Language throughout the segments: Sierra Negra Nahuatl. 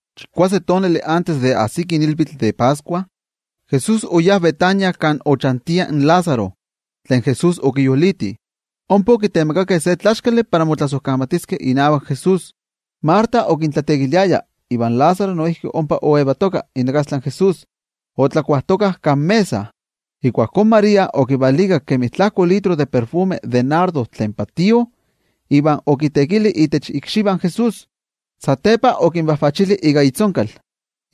Chikuase tonali antes de ajsiki ilvitl de Pascua, Jesús oyá Betania kan ochantia in Lázaro, tlen Jesús okiyoliti. Ompa okitemakakeh se tlaxkali para motlasojkamatiskeh inavak Jesús. Marta okintlateekiliaya iva Lázaro noijki ompa okatka inakastla in Jesús otlakuajtokah kan mesa. Ijkuakó María okivalikak kemi tlajko litro de ajviakayotl de nardo tlen patío, iva okiteekili itech ikxivah in Jesús, satepa okinvajvachili ika itzonkal.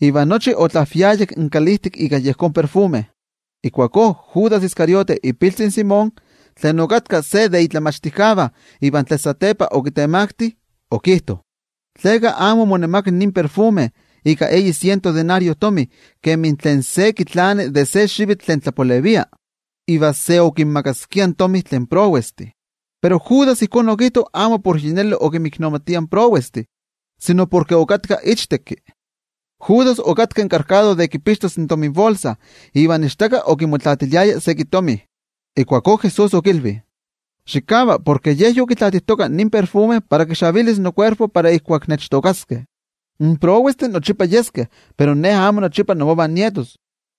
Iva nochi otlaajviayak in kalijtik ika yejón ajviakayotl. Ijkuakó Judas Iscariote ipiltzi in Simón, tlen okatka se de tlen momachtijkeh iva tlen satepa okitemakti in Jesús, okijto: —¿Tleka amo omonemakak nin ajviakayotl ika eyi siento denario kemi tlen se kitlani de se xivitl tlen tlapalevia, iva se okinmakaskia in tomi tlen prowestih? Pero Judas ijkó okijto amo porke yi neli okinmiknomatia in prowestih, sino porke okatka ichtekki. Judas yen okittaya in tominbolsa iva ichtaka okimotlaatiliaya seki tomi. Ijkuakó Jesús okilvi: —Xikava, porke ye yokitlaatijtoka nin ajviakayotl para kixavilis nokuerpo para ijkuak nechtookaskeh. In prowestih nochipa yeskeh, pero Ne amo nochipa inmovah nietos.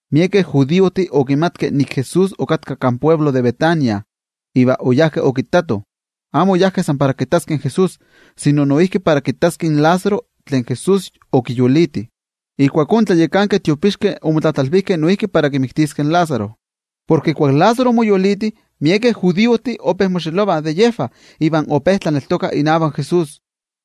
Miekeh judiojtih okimatkeh nik Jesús okatka kan altepetl de Betania, iva oyajkeh okittatoh. Amo oyajkeh san para kittaskeh in Jesús, sino noijki para kittaskeh in Lázaro, tlen Jesús okiyoliti. Ijkuakó in tlayakankeh tiopixkeh omotlatlalvijkeh noijki para kimiktiskeh in Lázaro. Porke ijkuak Lázaro omoyoliti, miekeh judiojtih ope moxelovah de yejvah iva ope tlaneltokah inavak Jesús.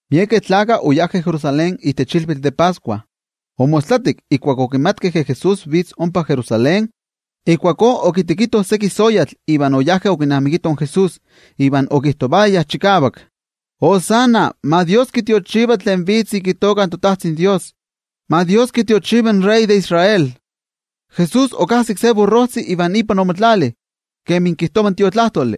Miekeh gentejtih oyajkeh Jerusalén itech ilvitl de Pascua. Omostlatik, ijkuak okimatkeh ke Jesús vitz ompa Jerusalén, ijkuakó okitekitoh seki soyatl iva oyajkeh okinamikitoh in Jesús. Iva okijtovayah chikavak: —¡Viva! ¡Ma Dios kitiochiva tlen vitz ika itoka toTajtzin Dios! ¡Ma Dios kitiochiva in wei tlanavati de Israel! Jesús okajsik se burrojtzi iva ipan omotlali. Kemi kijtova in Tiotlajkuiloli: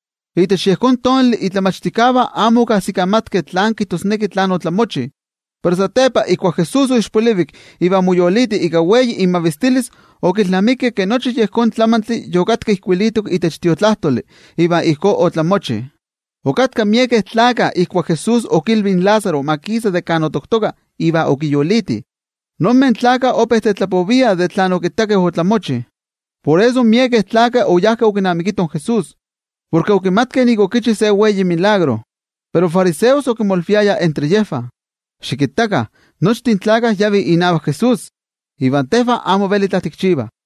Itech yejón tonali in momachtijkeh amo okajsikamatkeh tlán kijtosneki tlen otlamochivalok, pero satepa ijkuak Jesús oixpolivik iva omoyoliti ika wei imavistilis, okilnamikeh ke nochi yejón tlamantli yokatka ijkuilitok itech Tiotlajkuiloli, iva ijkó otlamochivalok. Okatkah miekeh gentejtih ijkuak Jesús okilvi in Lázaro ma kisa de kan otoktoka iva okiyoliti. Iva yejvah ope tetlapoviah de tlen okittakeh otlamochi. Por eso, miekeh gentejtih oyajkeh okinamikitoh in Jesús, porke okimatkeh nik okichi se wei tetzavkaneskayotl. Pero in fariseos okimolviayah entre yejvah: —Xikittakah, nochtin gentejtih yavih inavak Jesús. Iva tejvah amo veli itla tikchivah.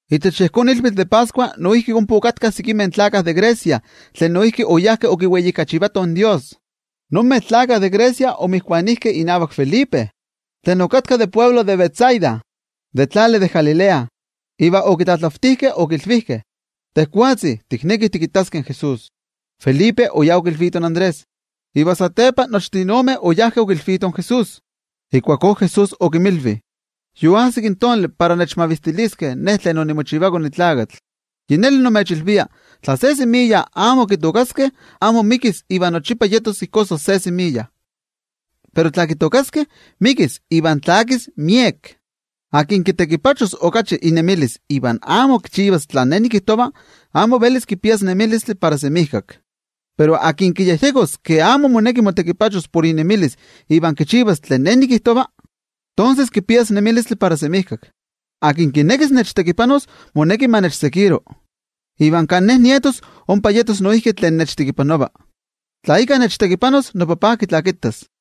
Itech yejón ilvitl de Pascua noijki ompa okatkah sekimeh gentejtih de Grecia tlen noijki oyajkeh okimavistilitoh in Dios. Ninmeh gentejtih de Grecia omotokijkeh inavak Felipe tlen okatka de altepetl de Betsaida de tlali de Galilea, iva okitlatlavtijkeh okilvijkeh: —Tejwatzi, tiknekih tikittaskeh in Jesús. Felipe oyá okilvito in Andrés, iva satepa nochtin ome oyajkeh okilvitoh in Jesús. Jesús okinnankili: —Yoajsik ora para kimavistiliskeh iKone in Tlakatl. Yi neli nimechilvia, tla se semiya amo kitookaskeh, amo mikis iva nochipa yetos ijkó san se semiya. Pero tla kitookaskeh, mikis iva tlakis miek. Tlen kitekipachos okachi inemilis iva amo kichivas tlen nikijtova, amo velis kipias nemilistli para semijkak. Pero tlen kiyejyekos ke amo moneki motekipachos por inemilis iva kichivas tlen nikijtova, tonses kipias nemilistli para semijkak. Tlen kinekis nechtekipanos, moneki ma nechseguiro. Iva kan Ne nietos, ompa yetos noijki tlen nechtekipanova. Tla íkka nechtekipanos, noTajtzi kitlakitas.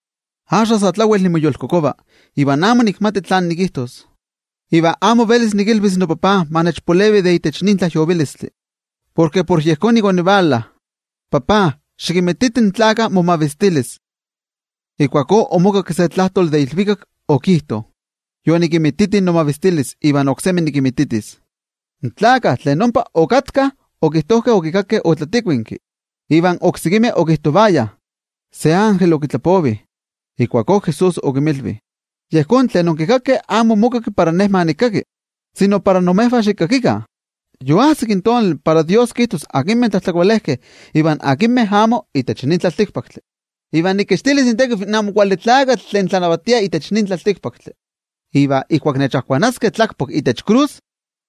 ’Axka sa tlawel nimoyolkokova, iva amo nikmati tlán nikijtos. Iva amo velis nikilvis noTajtzi ma nechpalevi de itech nin tlajyovilistli. Porke para yejón nik onivala. NoTajtzi, xikinmititi in gentejtih momavistilis. Ijkuakó omokakki se tlajtoli de ilvikak okijto: —Yonikinmititi nomavistilis iva oksemi nikinmititis. In gentejtih tlen ompa okatkah okijtojkeh okikakkeh otlatikuinki, iva oksekimeh okijtovayah: —Se ilvikaktlatitlanili okitlapovi. Ijkuakó Jesús okinmilvi: —Yejón tlen onkikakkeh amo omokakki para Ne ma nikkaki, sino para imejvah xikkakikah. Yoajsik in tonali para Dios kijtos akinmeh tlajtlakolejkeh iva akinmeh amo itech nin tlaltikpaktli, iva nikixtilis itekiv in Amo Kuali Tlakatl tlen tlanavatia itech nin tlaltikpaktli. Iva ijkuak nechajkuanaskeh tlakpak itech krus,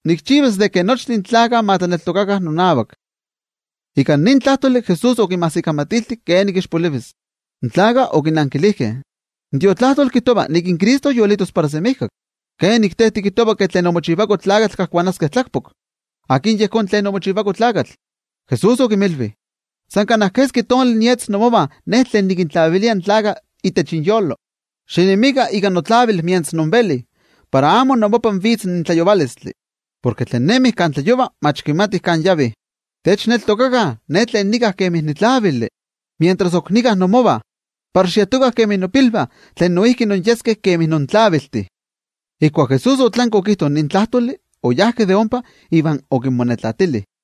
nikchivas ke nochtin gentejtih ma tlaneltokakah nonavak. Ika nin tlajtoli Jesús okinmajsikamatilti kenik ixpolivis. In gentejtih okinankilijkeh: —In Tiotlajkuiloli kijtova nik in Cristo yolitos para semijkak. ¿Kenik in te tikijtova ke iKone in Tlakatl kajkuanaskeh tlakpak? ¿Akin yejón iKone in Tlakatl? Jesús okinmilvi: —In tlavili ok yetos imovah sa kana keski tonali. Tos xinemikah itech tlavili mientras invelih, para amo inmopah vitz in tlayovalotl. Porke tlen nemih kan tlayova, amo kimatih kan yavih. Xitlaneltokakah inavak in tlavili mientras ok kajki inmovah, para xiekah intepilvah de yen tlavili. Ijkuak Jesús otlanki okijto nin tlajtoli, oyá de ompa iva okinmonetlatili.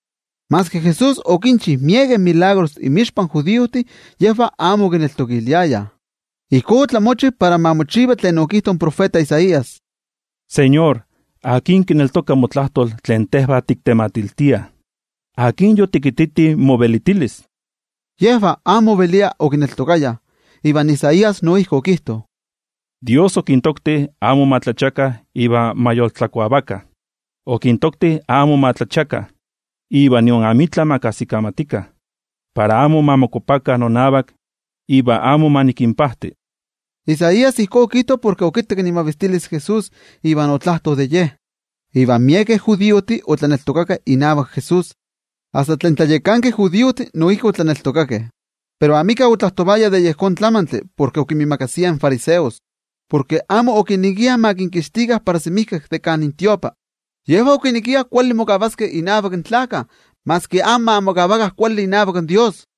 Maski Jesús okinchi miekeh tetzavkaneskayomeh inmixpa in judiojtih, yejvah amo okineltokiliayah. Ijkó otlamochivalok para ma mochiva tlen okijto in tiotenejmachti Isaías: NoTeko, ¿akin kineltoka motlajtol tlen tejvah tiktematiltiah? ¿Akin yotikititi movelitilis? Yejvah amo oveliah okineltokayah, iva Isaías noijki okijto: Dios okintokti amo ma tlachiakah iva ma yoltlakuavakah, okintokti amo ma tlachiakah, iva nion amitla ma kajsikamatikah, para amo ma mokuapakah nonavak, iva amo ma nikinpajti. Isaías ijkó okijto porke okittak imavistilis in Jesús, iva otlajto de Ye. Iva miekeh judiojtih otlaneltokakeh inavak Jesús, asta in tlayakankeh judiojtih noijki otlaneltokakeh, pero amika otlajtovaya de yejón tlamantli porke okinmiimakasiah in fariseos, porke amo okinekiah ma kinkixtikah para semijkak de kan tiotlamachtijkali. Yejvah okinekiah kuali mokavaskeh innavak in gentejtih maski amo ma mokavakah kuali inavak Dios.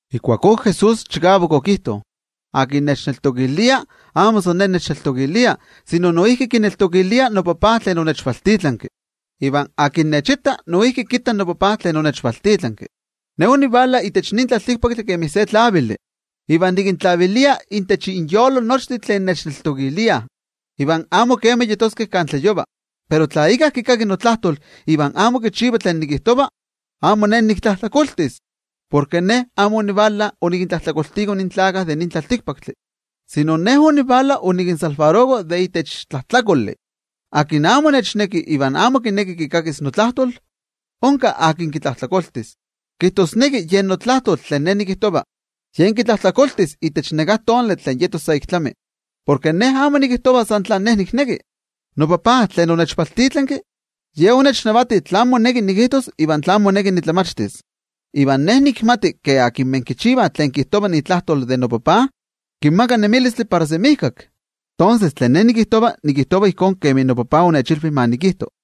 Ijkuakó Jesús chikavak okijto: —Tlen nechneltokilia, amo san Ne nechneltokilia, sino noijki kineltokilia noTajtzi tlen onechvaltitlanki. Iva tlen nechitta, noijki kitta noTajtzi tlen onechvaltitlanki. Ne onivala itech nin tlaltikpaktli kemi se tlavili. Iva nikintlavilia nochtin tlen nechneltokah, iva amo kema yeskeh kan tlayova. Pero tla íkka kikaki notlajtol iva amo kichiva tlen nikijtova, amo Ne niktlajtlakoltis. Porke Ne amo onivala onikintlajtlakoltiko in tlaltikpaktlakah, sino Ne onivala onikinmakixtiko de itech tlajtlakoli. Tlen amo nechneki iva amo kineki kikakis notlajtol, onka akin kitlajtlakoltis, kijtosneki yen notlajtol tlen Ne nikijtova, ye kitlajtlakoltis itech neká tonali tlen yetos sa ik tlami. Porke Ne amo nikijtova san tlen Ne nikneki. NoTajtzi tlen onechvaltitlanki, Ye onechnavati tlen moneki nikijtos iva tlen moneki nitlamachtis. Iva Ne nikmati ke tlen kichivah tlen kijtova itlajtol de noTajtzi, kinmaka nemilistli para semijkak. Tonses, tlen Ne nikijtova, nikijtova ijkó kemi noTajtzi onechilvi ma nikijto.